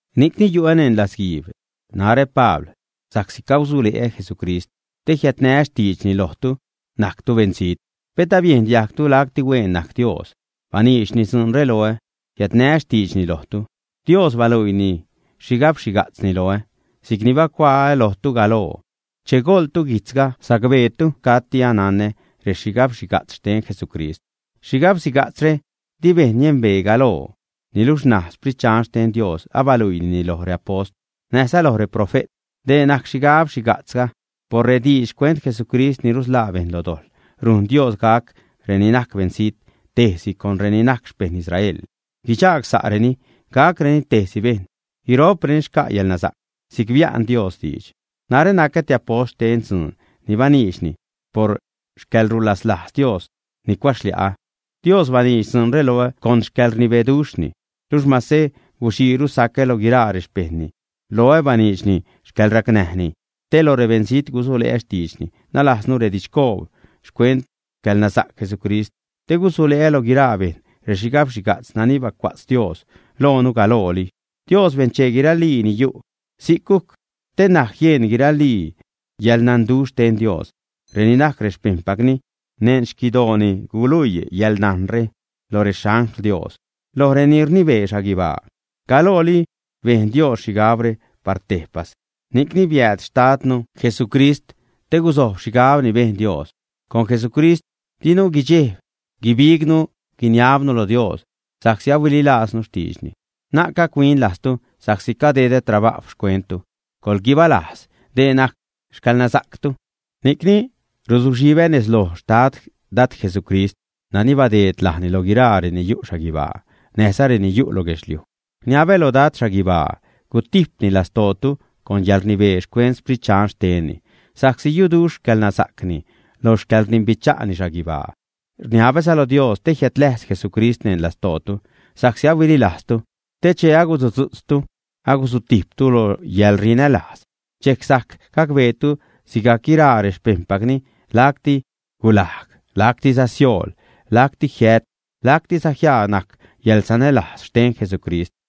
Ni'cni yu'ä neṉ latzguiib, narä, Pabl sa'csi cagusule'ä Jesucrist, te jiädnää́ xtiidxni lojtu, najctu beṉzijt. Pet abiejn diajgtu lacti hueen najc Dios baniidxni dzuunre loä, jiädnää́ xtiidxni lojtu. Dios baluiini xhigab-xhiga'tzni loä (si'cni bacuaä lojtu galoo). Che goḻtu guijtzga, sacbeetu cati ananä rexhigabxhiga'tz xten Jesucrist. Xhigab-xhiga'tzre di bejṉ niembee galoo, niluxh ṉaj Sprit Dxan xten Dios abaluiinini loj reapost näjza loj reprofe't. Dee najc xhigab-xhiga'tzga: por rediidx xcuent Jesucrist ni rusḻaa bejṉ neṉ dojḻ rujn Dios gac reni najc beṉzijt tejsi con reni najc xpeṉ Israel, guidxaag sa'reni, gacreni tejsi bejṉ. Guiro'preni xca' yälnasa'c si'c bia'n Dios diidx. Narä nacä te apost xten dzuun ni baniidxni, por xcäḻrulaslajz Dios ni cuaxlia'ä. Dios baniidx dzuunre loä con xcäḻrnibeduxhni. Luxh masä guxiiru sacä lo guiraa rexpejṉni, loä baniidxni xcäḻracnäjni te lo rebeṉzijt gusule'ä xtiidxni, nalajznu redidxcoob xcuent xcäḻnasa'c Jesucrist, te gusule'ä lo guiraa bejṉ rexhigabxhiga'tz nani bacua'tz Dios lojnu galooli. Dios benchee guiralii ni yu'. Si'c gujc te ṉaj jien guiralii yäḻnanduxh xten Dios. Reni najc xpejṉpacni neṉ xquidooni guluii yäḻnajnre lo rexangl Dios, loj reni rnibee xhaguibaa. Galooli bejn Dios xhigabre par tejpas, ni'cni biääd xtadnu Jesucrist te guzojb xhigab ni bejn Dios. Con Jesucrist dinu guidxejb guibignu, guiniabnu lo Dios sa'csi ahuililajznu xtiidxni. Na'c gac-huin lajztu sa'csi cadedä trabajw xcuenttu. Coḻguibalajz; dee najc xcäḻnasa'ctu. Ni'cni ruzuxhibä nez loj Xtad Dad Jesucrist nani badeed lajni lo guiraa reni yu' xhaguibaa näjza reni yu' lo guedxliuj, rniabä loj Dad xhaguibaa gutijpni lastootu con yäḻrnibee xcuent Sprit Dxan xtenni, sa'csi yuduxh xcäḻnasa'cni lo xcäḻrdimbicha'ni xhaguibaa. Rniabäza lo Dios te jiädläjz Jesucrist neṉ lastootu sa'csi ahuililajztu. Te che agusudzu'tztu, agusutijptu lo yäḻrinälajz dxejc sajc gacbeetu sigajc guiraa rexpejṉpacni lacti gulajg, lactiza siool, lacti jiät, lactiza jiaa najc yäḻsanälajz xten Jesucrist.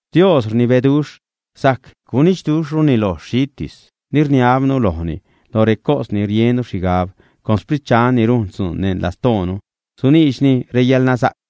Dios rnibeduxh. Sajc gunidxduxhruni loj xhitis ni rniabnu lojni, loj recos ni riennu xhigab. Con Sprit Dxan ni rujn dzuun neṉ lastoonu suniidxni reyäḻnasa'c.